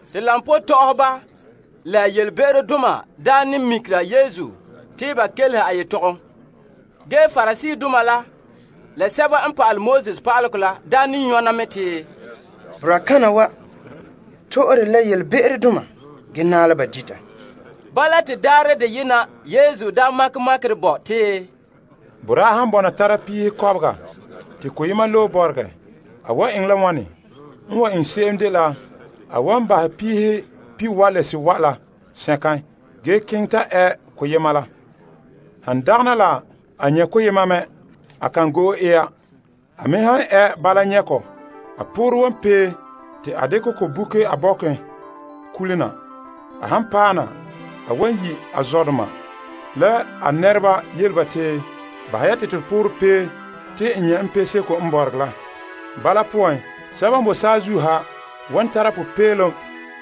Te koba tɔ'ɔhɔba la yelebe'erodoma daa ne mikera Yesu te ba kelehe a yetɔgom. Ge Pariseedoma la, la pa'alegɔ pa'aleba la ne nyɔna mɛ te, Boraa kana wa to'ore yelebe'erodoma ge naɛ la ba dita. Bala te daarɛ deyena Yesu makɛ makerɛ bo te, Boraa han bɔna tara a piihe kɔbega te koyema loe bɔregɛ, a wan eŋɛ la wane? N wan eŋɛ se'em dela a wan bahɛ piihe pihiwae' la sewae' la sɛnkan ge keŋɛ ta ɛ koyema la. Han dagana la a nyɛ' ko mɛ, a kan go'e ya. A me han ɛ bala nyɛ' ko, a poorɛ wan pee te a dekɛ ko boke a bɔken kula na. A han paɛ na, a wan yi' a zɔdoma, la a nɛreba yele ba te, Bahɛ ya te to poorɛ pee te n nyɛ' piseko n bɔregɛ la. Bala poan sɛba n boe saazuo ha wan tara popeelom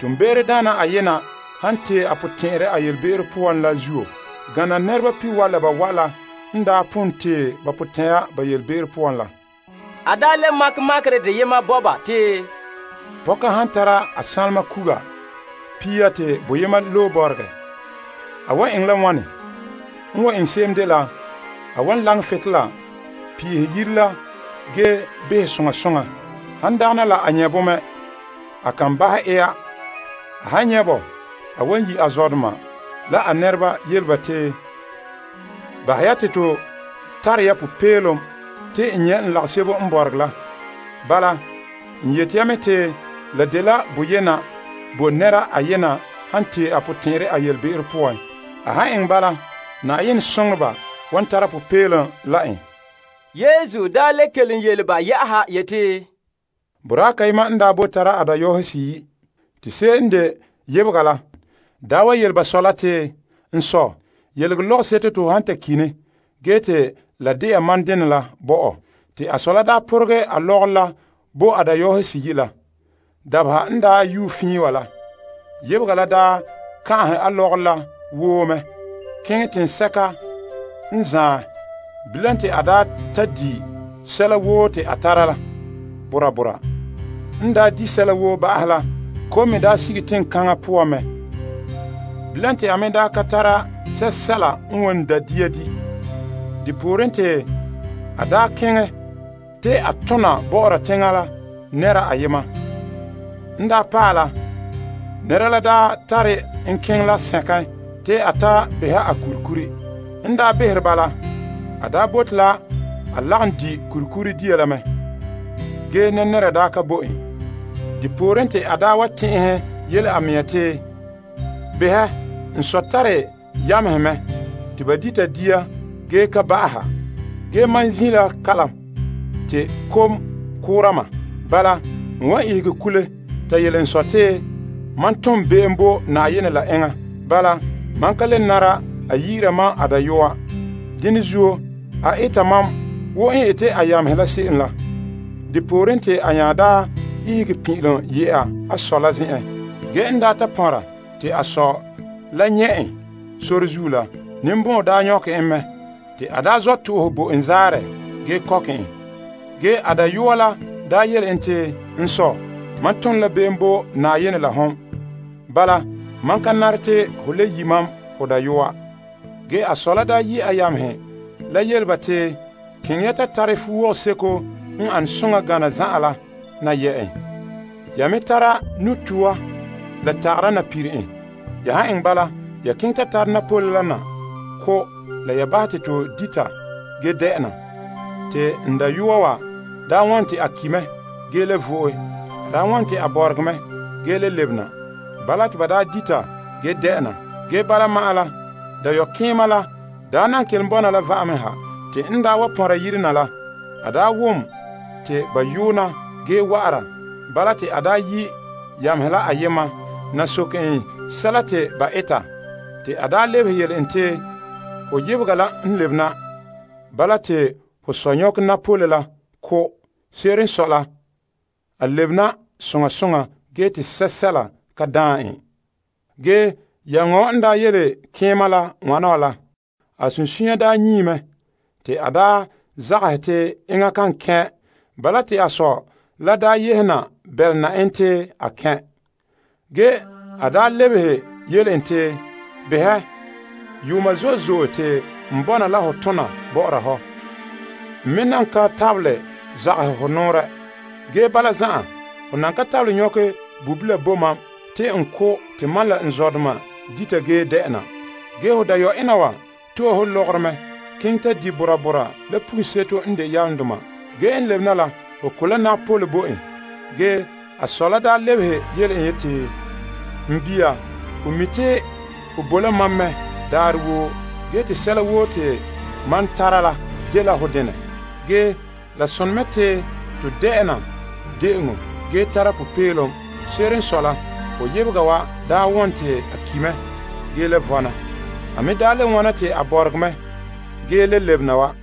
toonbe'erodaana ayena han tee a potɛn'ɛrɛ a yelebe'ero poan la zuo gana nɛreba pihiwae' la bawae' la n daa pon tee ba potɛn'ɛra ba yelebe'ero poan la. A le makɛ makerɛ deyema bo ba te, Pɔka han tara a ligikɔnba pia te boyema loe bɔregɛ, a wan eŋɛ la wane? N wan eŋɛ se'em dela a wan laŋɛ butolela peehɛ yire la ge behɛ soŋa soŋa. Han dagana la a nyɛ' bo mɛ, a kan bahɛ ɛ ya. A han nyɛ' bɔ, a wan yi' a zɔdoma, la a nɛreba yele ba te, Bahɛ ya te to tare ya popeelom te n nyɛ' n lagasebo n bɔregɛ la. Bala, n yete ya mɛ te la dela boyena bo nɛra ayena han tee a potɛn'ɛrɛ a yelebe'ero poan. A han eŋɛ bala, Na'ayenɛ soŋoreba wan tara popeelom la en. Yesu nya le kelom yele ba yɛ'ɛha yeti, Boraa kayema n daa boe tara a dayɔɔhe seyi'. Te se'em n de yebega la daa wa yele ba sɔ la te, n sɔ, yelege lɔgɔseto te ho han ta ki' ne ge te la de'a mam denɛ la bo mam. Te a sɔ la poregɛ a lɔgɔrɔ la bo a dayɔɔhe seyi' la. Dabeha n yue fiin wa la, yebega la kan'ahɛ a lɔgɔrɔ la woo mɛ keŋɛ teŋsɛka n zaan. Bilam te a ta di' sɛla woo te a tara la bora bora. N di' sɛla woo ba'ahɛ la, kom me sige teŋkaŋa la poan. Bilam te a me ka tara sɛsɛla n wan da' dia di'. Depooren, te a keŋɛ te a ta tona bɔ'ɔra teŋa la nɛra ayema. N paɛ la, nɛra la tare en keŋɛ la sɛnkan te a ta beha a kurikuri. N behere ba la, a bote a lagom di' kurikuri dia la mɛ. Ge nɛra ka bo en. Depooren te a wa tɛn'ɛhɛ yele a mea yeti, Behɛ, n sɔ tare yamehe mɛ te ba dita dia ge ka ba'aha. Ge mam zin' la kalam te kom koora mam. Bala, n wan ihege kule ta yele n sɔ te mam tom be'em bo Na'ayenɛ la enŋa. Bala, mam ka le nara a yi'ira mam a dayɔa. Dene zuo a eta mam wo n ete a yamehe la se'em la. Depooren te a nya ihege pin'ilom yɛ'a a sɔ la zen'en. Ge n ta pɔnra te a sɔ la nyɛ' en sore zuo la, ninbɔn'ɔn nyɔkɛ en mɛ. Te a sɔ to'ohɛ bo en zaarɛ ge kɔkɛ en. Ge a dayɔa la yele en te, N sɔ, mam tom la be'em bo Na'ayenɛ la hon. Bala, mam ka nare te ho le yi' mam ho dayɔa. Ge a sɔ la yi' a yamehe la yele ba te, Keŋɛ ya ta tare ya fuo seko n ane soŋa na yɛ' en. Ya me tare nu'toa la tagara na pire en. Ya han eŋɛ bala, ya keŋɛ ta tare napole la na ko' la ya bahɛ te to dita ge de'ena. Te n dayɔa wa wɔn te a ki' mɛ ge le vo'e. A wɔn te a bɔregɛ mɛ ge le lebena. Bala te ba dita ge de'ena. Ge bala, ma'an la, dayɔkeema la daa nan kelom bɔna la va'ame ha. Te n wa pɔnra yire na la, a wom te ba yoona ge wa'ara. Bala te a yi' yamehe la ayema na soke en sɛla te ba eta. Te a lebehe yele en te, Ho yebega la n lebena. Bala te ho sɔ nyɔkɛ napole la ko'. Se'ere n sɔe la, a lebena soŋa soŋa ge te sɛla ka daan en. Ge yameŋa wa n yele keema la wana wa la, a sunsunya nyii mɛ te a daa zagahɛ te enŋa kan kɛn'. Bala te a sɔ la daa yehe na bɛlena en te a kɛn'. Ge a lebehe yele en te, Behɛ, yuuma zo'e zo'e te n bɔna la hɔ tona bɔ'ɔra hɔ. N me nan ka tabelɛ zagahɛ hɔ nɔɔrɛ. Ge bala zan'an, ho nan ka tabelɛ nyɔkɛ ge bobila bo mam te n ko' te mam la n zɔdoma dita ge de'ena. Ge ho dayɔ'ena wa to'e ho lɔgɔrɔ mɛ keŋɛ ta di bora bora la pugunseto n de yalomdoma. Ge n lebe na la, ho ko' la napole bo en. Ge a sɔ la daa lebehe yele en yeti, N bia, ho mi' te hon boe la mam mɛ daarɛ woo ge te sɛla woo te mam tara la, dela ho denɛ. Ge, la sone mɛ te to de'ena de'eŋɔ ge tara popeelom. Se'ere n sɔe la, ho yebega wa daa won te a ki' mɛ ge le vɔna. A me daa le wona te a bɔregɛ mɛ ge le lebena wa.